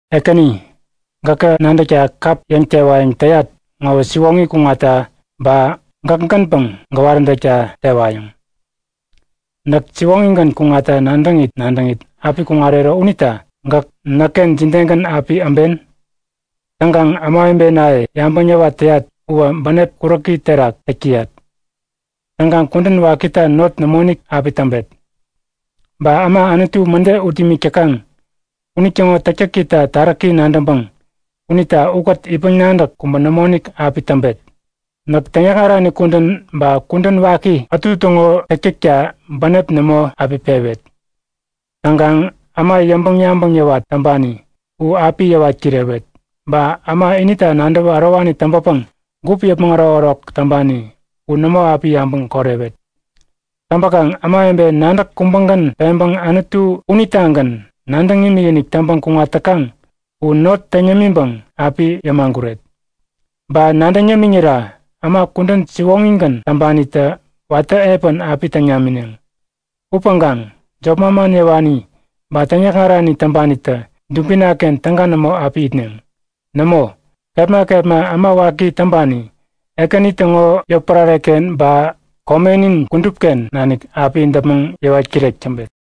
Ekäni, gäkä nadäkta kap yäŋ-tewayäŋ täyat ŋowä siwoŋi kuŋatta ba gäkgänpäŋ gäwaräntäkta tewayäŋ. Näk siwoŋigän kuŋatta nadäŋit nadäŋit api kuŋarero unita gäk näkken jidegän api äben? Täŋkaŋ ämawebenaye yabäŋ yäwat täyat uwä bänep kuräki terak täk täyat. Täŋkaŋ kudän wakita not nämoinik api täŋpet. Ba äma Anutu mäde ut imik täkaŋ unitäŋo täktäkita taräki nadäŋpäŋ unita ukät itpäŋ-nadäk kubä nämoinik api täŋpet. Näk täŋyäkŋarani kudän ba kudän waki ätu täŋo täktäkta bänep nämo api pewet. Täŋkaŋ äma yäŋpäŋ-yabäŋ yäwat täŋpani u api yäwat kirewet. Ba äma inita nadäwä ärowani täŋpäpäŋ gup yäpmäŋ ärokärok täŋpani u nämo api yabäŋ korewet. Täŋpäkaŋ ämawebe nadäk kubägän peŋpäŋ Anutu unitagän nadäŋ imikinik täŋpäŋ kuŋat täkaŋ u not täŋ yämiŋpäŋ api yämaguret. Ba nadäŋ yämiŋira äma kudän siwoŋigän täŋpanitä watä epän api täŋ namineŋ. Upäŋkaŋ jop manman yäwani ba täŋyäkŋarani täŋpanitä dubinaken täga nämo api itneŋ. Nämo, kepma kepma äma waki täŋpani Ekäni täŋo yotpärareken ba komenin kudupken nanik api däpmäŋ yäwat kirek täŋpet.